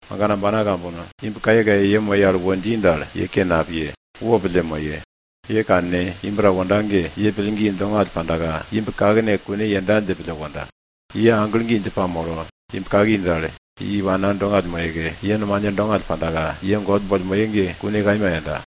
Agana ambana kambono, imb kayekaye ye moye al ta wo dji dal, ye ke napiye, ye wopille moye. Ye kanne, imb ta wonda ge, ye pillgi dongall pandaka imb kakne kune yenda dje pille wonda. Ye aglo gi dje pamolo, imb kaki dal, ye iwana dongall moyeke, ye nomane dongall pandaka, ye God boll moye ge kune kaima yenda.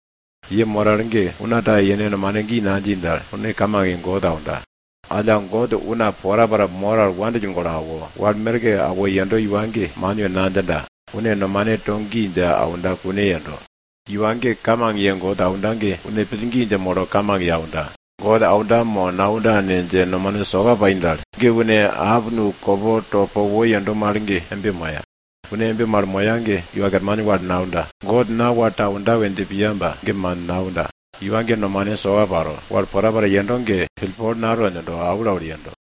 Ye mor al ge una ta yene nomane gi nadji dal, une kamang ye God aunda. Alla God una porapora mor al wandill golo awo, wal merke aundo iwa ge, man we nadjinda, une nomane to gi dje aunda, kune yendo. Iwa ge kamang ye God aunda ge, une pillgi dje molo kamang ye aunda. God aunda, mo naunda ne dje nomane soka pai dal, ge une nusolwara kopo to po wo yendo mal ge embe moya. Une embe mal moya ge Iwa Kerman wal naunda, God na wal ta aunda we dje piya ba, ge man, naunda. Iwa ge nomane soka paro, wal porapora yendo ge pillpol nato djindo, aulaul yendo.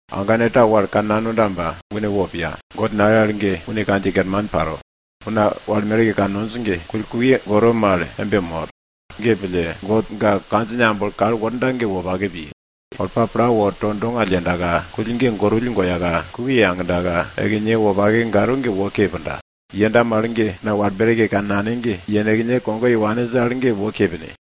Agane ta wal kannanonda ba une wo piya, God nale al ge une kandjiye kerman panda. Una wal merke kannonj ge, kull kukye gorowill goro mal embe mor. Ge pille, God ga kandjine amblo kal worda ge wopake piye. Olpa pla wo to dongall yendaka, kull ge gorowill goyaka, kukye yagdaka, ekinye wopake garo ge wo ke punda. Yenda mal ge, una wal merke kannane ge, yenekne kogo ye waninj al ge wo ke pine.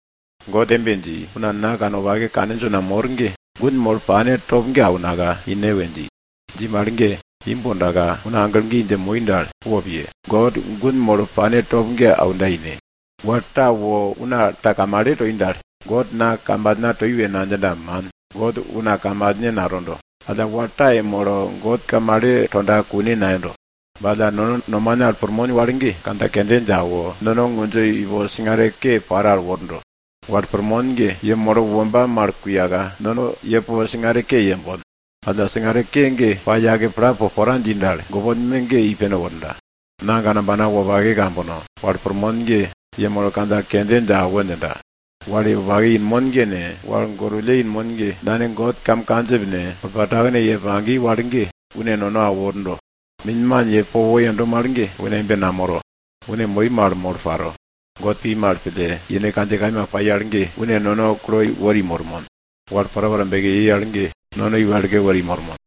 God embe dji, una na kanwopake kaninj una mor ge, gun molo pane top ge aunaka ine we dji. Dji mal ge, imb wondaka, una aglo gi dje moi dal, wopiye, God gun molo pane top ge aunda ine. Wal ta wo una ta kamale toi dal, God na kamalna toi we nadjinda, man. God una kamalne natondo, alla wal ta yemolo God kamale tonda kune nayendo. Ba alla nono nomane al pirmon wal ge, kandja kende dje awo, nono ngundjo ipo singare ke paro al wordo. Wal pirmon ge, yemolo womba mal kuyaka, nono po singare ke yembon. Alla singare ke ge pa yake pla po pora dji dal, gopon me ge i pene worda. Na agana ambana wopake kambono, wal pirmon ge, yemolo kandja kende dje awo djinda. Wal wopake inmon ge ne, wal gorwulle inmon ge, Nane God kam kandjip ne, olpa takene ye pagi iwa ge, une nono awo wordo. Minman ye po wo yendo mal ge une embe namoro. Une moi mal molo paro. God pi mal pille, yene kandjiye kaima pai al ge, une nono kui una mormon. Wal porapora beki yei al ge, nono i wekle wori mormon.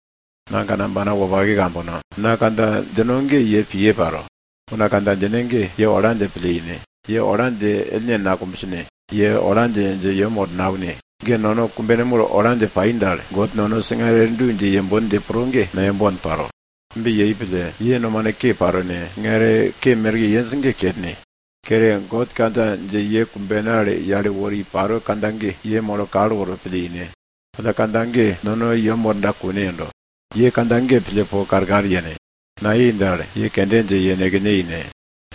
Na agana ambana wopake kambono, na kandja djindo ge ye piye paro. Una kandja djine ge, ye ola dje pille ine, ye ola dje ellne nakumbsne, ye ola dje, dje yem woro naune. Nono kumbene mul ola dje pai dal, God nono singare du dje yembon dje pro ge, nayembon paro. Embe yei pille, ye nomane ke paro ne, singare ke merke yenj ge kerne. Kere, God kandja dje ye kumbene al yale wori paro kandja ge, ye molo kal woro pille ine. Alla kandja ge, nono i yem worda, kune yendo. Ye kandja ge pille po karkar yene. Nayei dal, ye kende dje yenekne ine.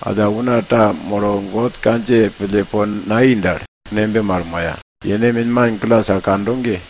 Una ta molo God kandjiye pille po nayei dal, une embe mal moya. Yene minman glas al kando ge,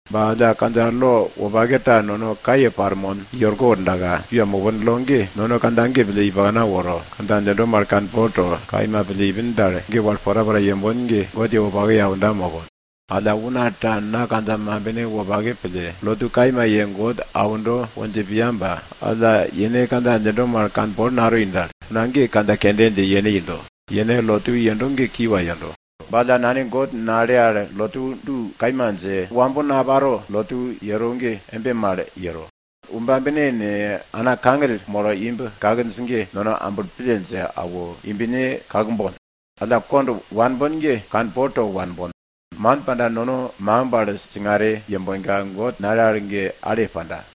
Ba alla kandja lo wopake ta nono kaye parmon i orko wordaka, kiwa mopon lo ge, nono kandja ge pille i pakna woro, kandja djindo mal kanpol to, kaima pille ipin dal, ge wal porapora yembon ge God ye wopake ye aunda mopon. Alla una ta na kandja mambine wopake pille, lotu kaima ye God aundo we dje piya ba alla, yene kandja djindo mal kanpol natoi dal, une ge kandja kende dje yene indo, yene lotu yendo ge kiwa yendo. Ba alla Nane God nale al lotu du kaima dje, wambo naparo lotu yero ge embe mal yero. Womba bine ne, ana kangill molo imb kakinj ge, nono amblo pille dje awo, imbne kakbon. Alla kond wanbon ge, kanpol to wanbon, man panda nono makimb al singare yembonka, God nale al ge ale panda.